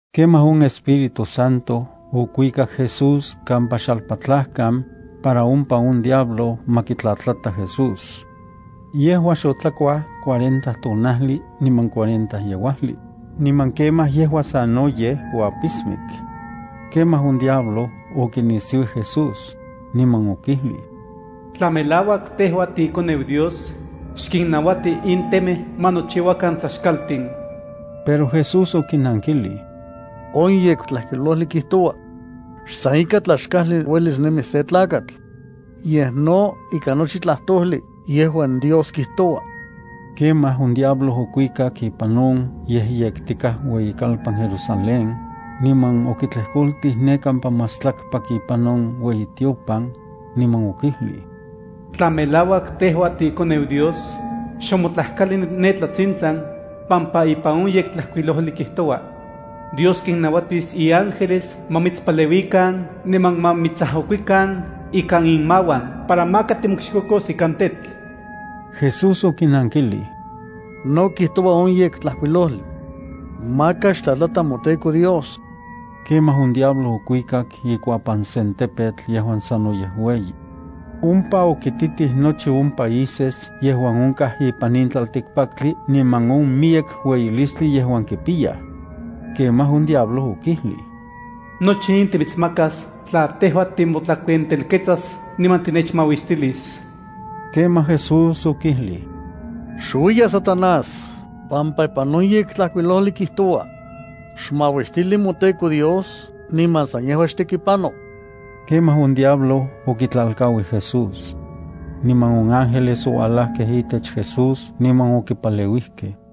Kemaj on Espíritu Santo okuikak Jesús kampa xalpatlajkan, para ompa on diablo ma kitlatlata Jesús. Yejua xotlakuaj cuarenta tonajli niman cuarenta yeuajli, niman kemaj yejua sanoyej oapismik. Kemaj on diablo okinisiuij Jesús, niman okijlij: —Tla melauak tejua tiiKoneu Dios, xkinnauati in temej ma nochiuakan tlaxkaltin. Pero Jesús okinankilij: —On Yektlajkuilojli kijtoua: “Xsan ikan tlaxkajli uelis nemis sen tlakatl, yej no ikan nochi tlajtojli yejuan Dios kijtoua.” Kemaj on diablo okuikak ipan on yejyektikaj ueyikalpan Jerusalén, niman okitlejkoltij ne kampa más tlakpak ipan on ueyitiopan, niman okijlij: —Tla melauak tejua tiiKoneu Dios, xonmotlajkali ne tlatsintlan, pampa ipan on Yektlajkuilojli kijtoua: Dios kinnauatis iángeles ma mitspaleuikan, niman mitsketsteuaskej ika inmauan para maka timokxikokos ikan tetl. Jesús okinankilij: —No kijtoua on Yektlajkuilojli: “Maka xtlatlata moTEKO Dios.” Kemaj on diablo okuikak ikuapan sen tepetl yejuan sanoyej ueyi. Ompa okititij nochi on países yejuan onkaj ipan in tlaltikpaktli niman on miyek ueyilistli yejuan kipiyaj. Kemaj on diablo okijlij: —Nochi in nimitsmakas tla tejua timotlakuantelketsas niman tinechmauistilis. Kemaj Jesús okijlij: —Xuiya Satanás, pampa ipan on Yektlajkuilojli kijtoua: “Xmauistili moTEKO Dios, niman san yejua xtekipano.” Kemaj on diablo okitlalkauij Jesús. Niman on ángeles oualajkej itech Jesús niman okipaleuijkej.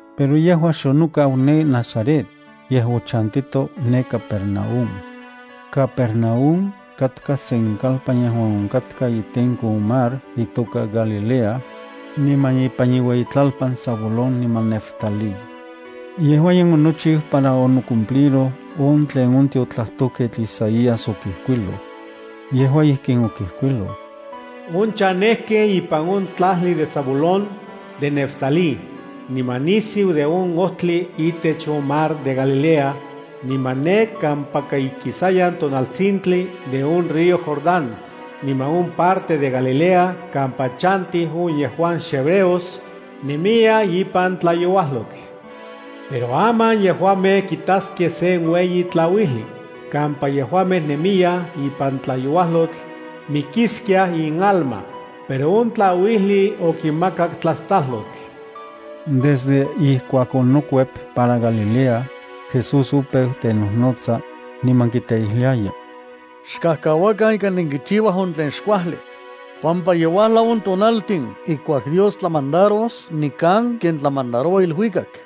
Pero yejua xonokau ne Nazaret, yej ochantito ne Capernaúm. Capernaúm katka sen kalpan yejuan onkatka itenko on mar itoka Galilea niman ipan inueyitlalpan Zabulón niman Neftalí. Yejua in onochiu para onocumpliroj on tlen on tiotlajtojketl Isaías okijkuiloj. Yejua ijkin okijkuiloj: On chanejkej ipan on tlajli de Zabulón, de Neftalí, niman nisiu de on ojtli itech on mar de Galilea, niman ne kampaka ikisayan tonaltsintli de on río Jordán, niman on parte de Galilea kampa chantij on yejuan xhebreos, nemiyaj ipan tlayouajlotl. Pero aman yejuamej kitaskej sen ueyi tlauijli. Kampa yejuamej nemiyaj ipan tlayouajlotl, mikiskia inalma, pero on tlauijli okinmakak tlastajlotl. Desde ijkuak onokuep para Galilea, Jesús opeu tenojnotsa, niman kiteijliaya: —Xkajkauakan ika nenkichiuaj on tlen xkuajli, pampa ye uajlau on tonaltin ijkuak Dios tlamandaros nikan ken tlamandaroua iluikak.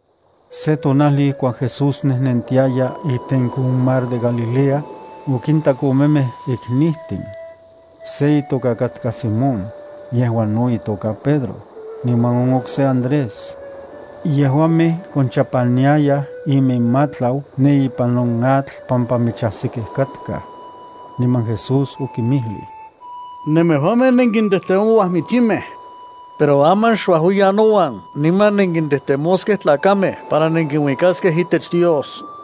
Se tonajli ijkuak Jesús nejnentiaya itenko on mar de Galilea, okintak omemej iknijtin. Se itoka katka Simón, yejuan no itoka Pedro, niman on okse Andrés. Yejuamej konchapaniayaj iminmatlau ne ipan on atl pampa michajsikej katkaj. Niman Jesús okinmijlij: —Nemejuamej nenkintejtemouaj michimej. Pero aman xuajuiyan nouan niman nenkintejtemoskej tlakamej para nenkinuikaskej itech Dios.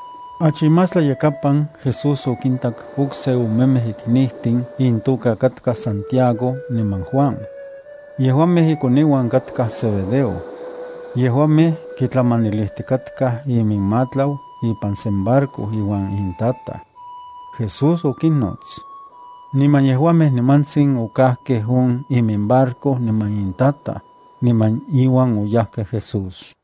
Achi más tlayakapan Jesús okintak okse omemej iknijtin intoka katka Santiago niman Juan. Yejuamej ikoneuan katkaj Zebedeo. Yejuamej kitlamanilijtikatkaj iminmatlau ipan se barco iuan intataj. Jesús okinnots, niman yejuamej nimantsin okajkej on iminbarco niman intataj, niman iuan oyajkej Jesús.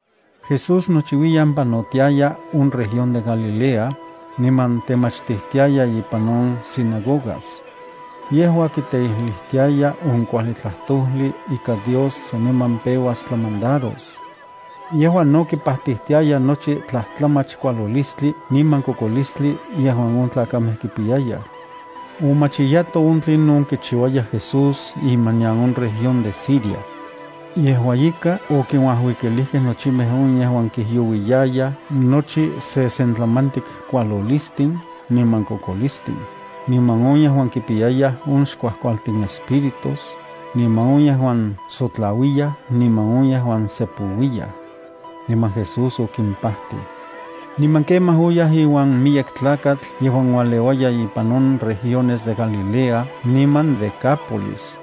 Jesús nochiuiyan panotiaya on región de Galilea, niman temachtijtiaya ipan on sinagogas. Yejua kiteijlijtiaya on kuajli tlajtojli ika Dios saniman peuas tlamandaros. Yejua no kipajtijtiaya nochi tlajtlamach kualolistli niman kokolistli yejuan on tlakamej kipiyayaj. Omachiyato on tlinon kichiuaya Jesús imanian on región de Siria. Yejua ika okinuajuikilijkej nochimej on yejuan kijyouiyayaj nochi sesentlamantik kualolistin niman kokolistin, niman on yejuan kipiyayaj on xkuajkualtin espíritus, niman on yejuan sotlauiyaj niman on yejuan sepouiyaj. Niman Jesús okimpajtij. Niman kemaj oyaj iuan miyek tlakatl yejuan ualeuaya ipan on regiones de Galilea, niman Decápolis.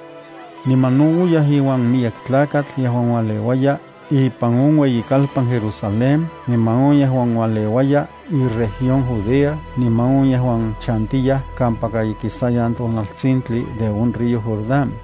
Niman no oyaj iuan miyek tlakatl yejuan ualeuaya ipan on ueyikalpan Jerusalén niman on yejuan ueleuaya iregión Judea niman on yejuan chantiyaj kampaka ikisayan tonaltsintli de on río Jordán.